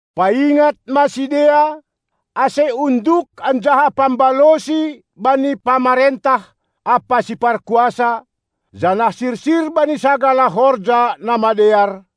Paingat ma sidea, ase unduk anjaha pambalosi bani pamarentah ampa siparkuasa, janah sirsir bani sagala horja na madear,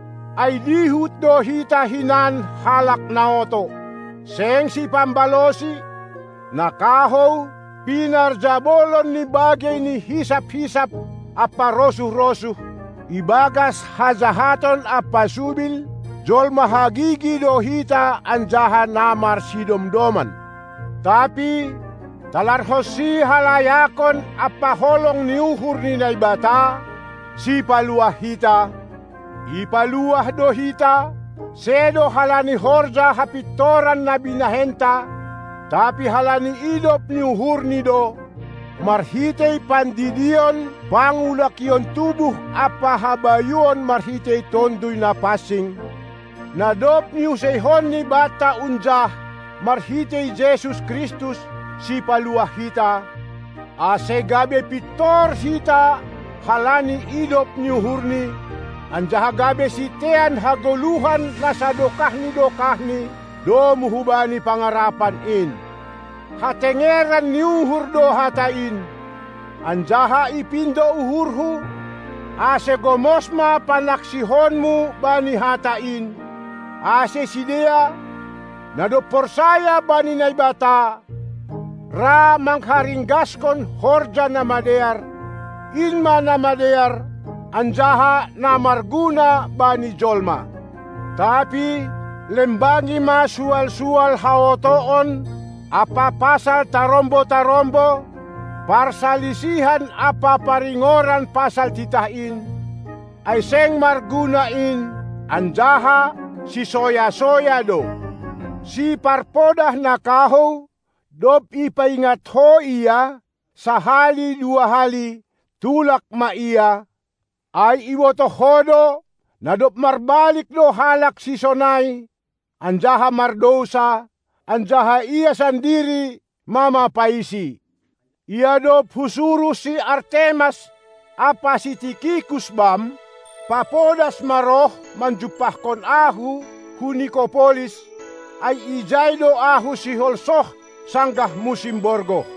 Ai dihut do hita hinan halak na oto, seng sipambalosi, na kahou, pinarjabolon ni bagei ni hisap-hisap ampa rosuh-rosuh, ibagas hajahaton ampa subil; jolma hagigi do hita anjaha na marsidomdoman. Tapi talarhonsi halayakon ampa holong ni uhur ni Naibata, Sipaluah hita, ipaluah do hita, sedo halani horja hapintoran na binahenta, tapi halani idop ni uhurNi do, marhitei pandidion pangulakion tubuh ampa habayuon marhitei Tonduy Napansing, na dob niuseihonNi banta unjah, marhitei Jesus Kristus, Sipaluah hita, ase gabe pintor hita halani idop ni uhurNi, anjaha gabe sitean hagoluhan na sadokah ni dokahni, domu hubani pangarapan in. Hatengeran ni uhur do hata in, anjaha ipindo uhurhu, ase gomos ma panaksihonmu bani hata in, ase sidea, na dob porsaya bani Naibata, ra mangharinggashon horja na madear; in ma na madear anjaha na marguna bani jolma. Tapi lembangi ma sual-sual haotoon ampa pasal tarombo-tarombo, parsalisihan ampa paringoran pasal titah in, ai seng marguna in anjaha sisoya-soya do. Siparpodah na kahou, dob ipaingat ho ia sahali dua hali, tulak ma ia, ai ibotoh ho do, na dob marbalik do halak sisonai anjaha mardousa; anjaha ia sandiri mamapaisi. Ia dob husuruh si Artemas ampa si Tikikus bam, papodas ma roh manjumpahkon ahu hu Nikopolis, ai ijai do ahu sihol soh sanggah musim borgoh.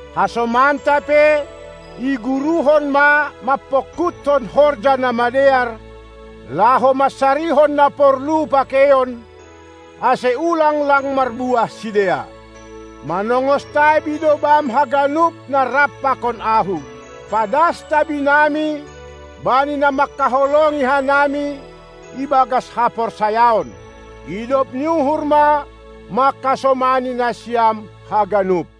Hasomanta pe iguruhon ma mampongkuthon horja na madear, laho mansarihon na porlu pakeion, ase ulang lang marbuah sidea. Manongos tabi do bam haganup na rap pakon ahu. Padas tabinami bani na manghaholongi hanami ibagas haporsayaon. Idop ni uhur ma mangkasomani nasiam haganup!